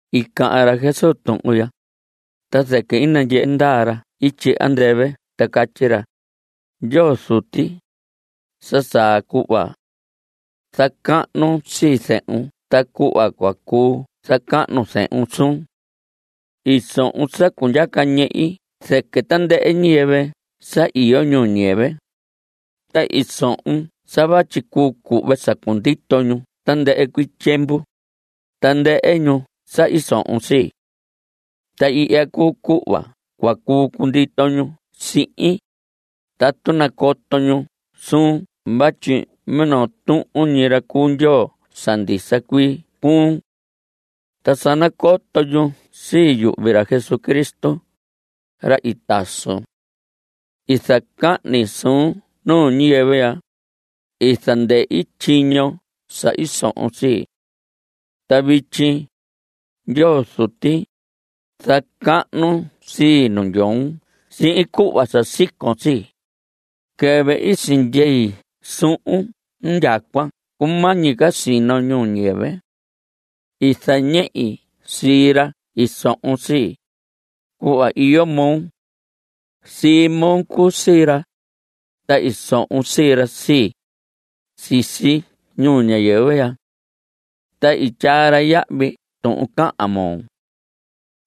I cahan ra Jesús tuhun ya, ta zɨquɨ i nandyehe ndaa ra ityi andɨvɨ ta catyi ra: Ndyoo Zuti, sa saa cuhva. Zacahnun sii zehun ta cuhva cua cuu zacahnu zehun suun. I sohon sa cundyaca ñehi zɨquɨ tandɨhɨ ñiyɨvɨ sa iyo ñuu ñiyɨvɨ, ta i sohon sa vatyi cuu cuhve sa cundito ñu tandɨhɨ cuii tyiemvu, tandɨhɨ ñu sa i sohon sii. Ta ihya cuu cuhva cua cuu cundito ñu sihin, tatu nacoto ñu suun vatyi minoo tuhun ñi ra cuu Ndyoo sa ndisa cuii cuun. Ta sa nacoto ñu sii yuhvi ra Jesucristo, ra i tasun. I zacahni suun ñuu ñiyɨvɨ ya. I zandɨhi tyiño sa i sohon sii. Ta vityi, Ndyoo Zuti, zacahnun sii nu ndyoon sihin cuhva sa sicoo sii, quɨvɨ i sindyei suhun indyacuan cumañi ca sino ñuu ñiyɨvɨ. I zañehi sii ra i sohon sii, cuhva iyo moo. Sii moo cuu sii ra, ta i sohon sii ra sii, sisi ñuu ñiyɨvɨ ya. Ta i tyaa ra yahvi tuhun cahan moo.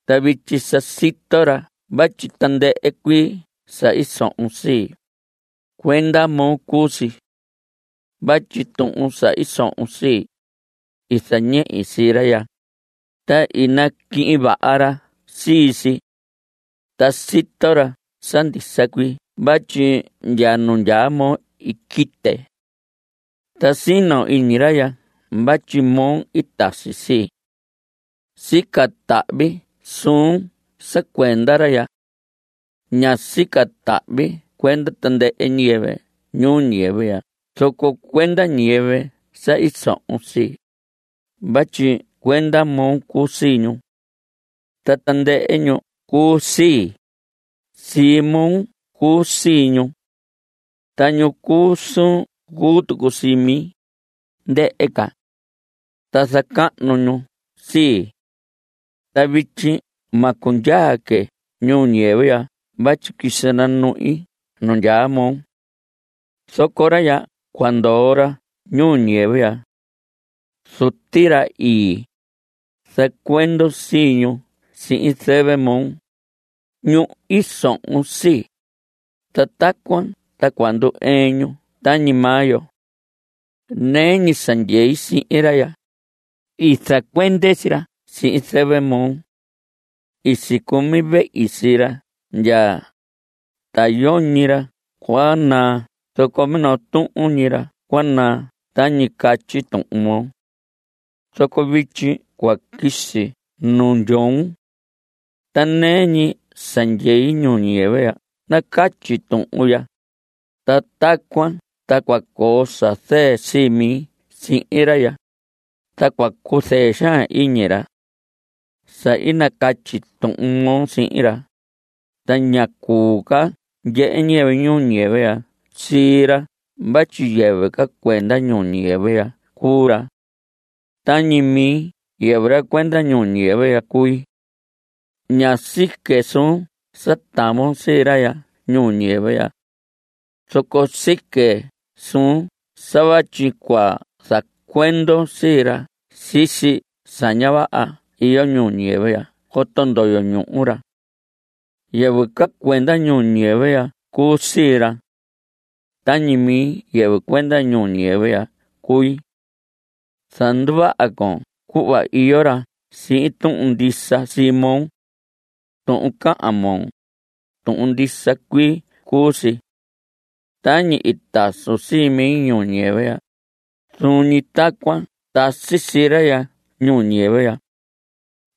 Ta vityi sa sito ra vatyi tandɨhɨ cuii sa i sohon sii, cuenda moo cuu si. Vatyi tuhun sa i sohon sii, i zañehi sii ra ya, ta i naquihin vaha ra sii si. Ta sito ra sa ndisa cuii vatyi ndya nu ndyaa moo i quite. Ta sino iñi ra ya vatyi moo i tasi sii. Sica tahvi suun sa cuenda ra ya. Ña sica tahvi cuenda tandɨhɨ ñiyɨvɨ ñuu ñiyɨvɨ zoco cuenda ñiyɨvɨ sa i sohon sii, vatyi cuenda moo cuu sii ñu. Ta tandɨhɨ ñu cuu sii, sii moo cuu sii ñu. Ta ñu cuu suun cuu tucu sii mi, ndɨhɨ ca. Ta zacahnu ñu sii. Ta vityi ma cundyaa que ñuu ñiyɨvɨ ya vatyi quisi nanuhin nu ndyaa moo. Zoco ra ya cua ndoo ra ñuu ñiyɨvɨ ya. Zuti, ra ii, zacuendon sii ñu sihin zɨvɨ moo, ñu i sohon sii, ta tacuan ta cua ndu‑ɨɨn ñu tañi maa yo. Nɨɨ ñi sa ndyei sihin ra ya, i zacuende sii ra sihin zɨvɨ moo. I sicumi vehi sii ra ya, ta yoñi ra cua naa zoco minoo tuhun ñi ra cua naa tañi catyi Tuhun moo. Zoco vityi cua quisi nu ndyoon. Ta nɨɨ ñi sa ndyei ñuu ñiyɨvɨ ya nacatyi tuhun ya, ta tacuan ta cua coo sa zɨɨ sii mi sihin ra ya, ta cua cuzɨɨ xaan iñi ra. Sa i nacatyi Tuhun moo sihin ra, ta ña cuu ca ndyehe ñiyɨvɨ ñuu ñiyɨvɨ ya sii ra vatyi yɨvɨ ca cuenda ñuu ñiyɨvɨ ya cuu ra. Tañi mi yɨvɨ ra cuenda ñuu ñiyɨvɨ ya cui. Ña sique suun sa tavon sii ra ñuu ñiyɨvɨ ya. Zoco sique suun sa vatyi cua zacuendon sii ra sisi sa ña vaha iyo ñuu ñiyɨvɨ ya coto ndoyo ñuhu ra. Yɨvɨ ca cuenda ñuu ñiyɨvɨ ya cuu sii ra. Tañi mi yɨvɨ cuenda ñuu ñiyɨvɨ ya cui. Zanduvaha con cuhva iyo ra sihin tuhun ndisa sii moo. Tuhun cahan moo, tuhun ndisa cuii cuu si. Tañi i tasun sii mi ñuu ñiyɨvɨ ya, zuun ñi tacuan tasi sii ra ya ñuu ñiyɨvɨ.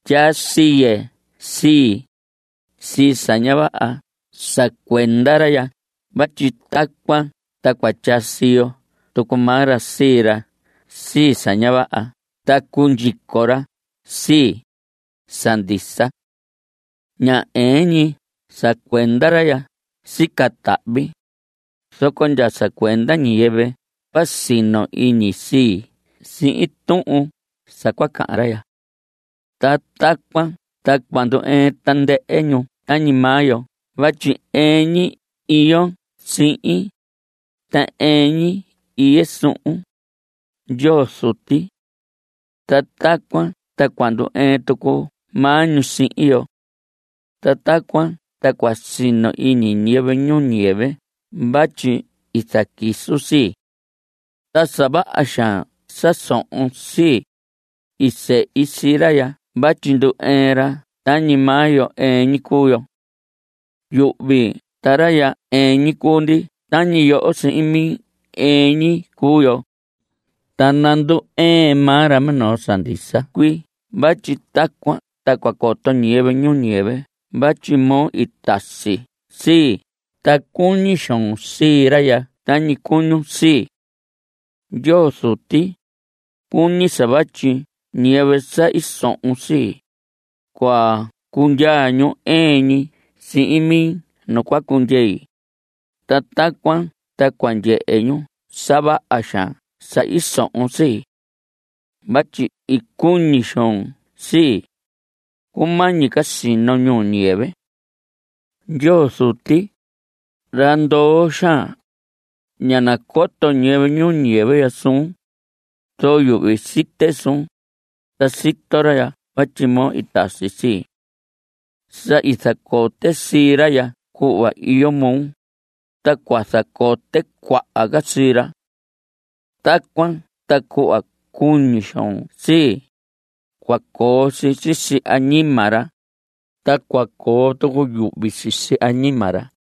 Tyaa siye sii, sii sa ña vaha sa cuenda ra ya vatyi tacuan ta cua tyaa siyo tucu maa ra sii ra sii sa ña vaha ta cundyico ra sii, sa ndisa. Ña ɨɨn ñi sa cuenda ra ya sica tahvi, zoco ndya sa cuenda ñiyɨvɨ cua sino iñi sii sihin tuhun sa cua cahan ra ya. Ta tacuan ta cua ndu‑ɨɨn tandɨhɨ ñu tañi maa yo vatyi ɨɨn ñi iyon sihin, ta ɨɨn ñi iye suhun, Ndyoo Zuti. Ta tacuan ta cua ndu‑ɨɨn tucu maa ñu sihin yo. Ta tacuan ta cua sino iñi ñiyɨvɨ ñuu ñiyɨvɨ vatyi i zaquisun sii. Ta sa vaha xaan sa sohon sii, i sehi sii ra ya vatyi ndu‑ɨɨn ra tañi maa yo ɨɨn ñi cuu yo. Yuhvi ta ra ya ɨɨn ñi cuu ndi tañi yoho sihin mi ɨɨn ñi cuu yo, ta nandu‑ɨɨn maa ra minoo sa ndisa cuii vatyi tacuan ta cua coto ñiyɨvɨ ñuu ñiyɨvɨ vatyi moo i tasi sii ta cuñi xoon sii ra ya tañi cuñun sii. Ndyoo Zuti, cuñi sa vatyi ñiyɨvɨ sa i sohon sii, cua cundyaa ñu ɨɨn ñi sihin mi nu cua cundyei, ta tacuan ta cua ndyehe ñu sa vaha xaan sa i sohon sii. Vatyi i cuñi xoon sii, cumañi ca sino ñuu ñiyɨvɨ. Ndyoo Zuti, ra ndoo xaan, ña nacoto ñiyɨvɨ ñuu ñiyɨvɨ ya suun, zoco yuhvi site suun, ta sito ra ya vatyi moo i tasi sii. Sa i zacote sii ra ya cuhva iyo moo, ta cua zacote cuaha ca sii ra. Tacuan ta cuhva cuñi xoon sii, cua coo si sisi añima ra, ta cua coo tucu yuhvi sisi añima ra.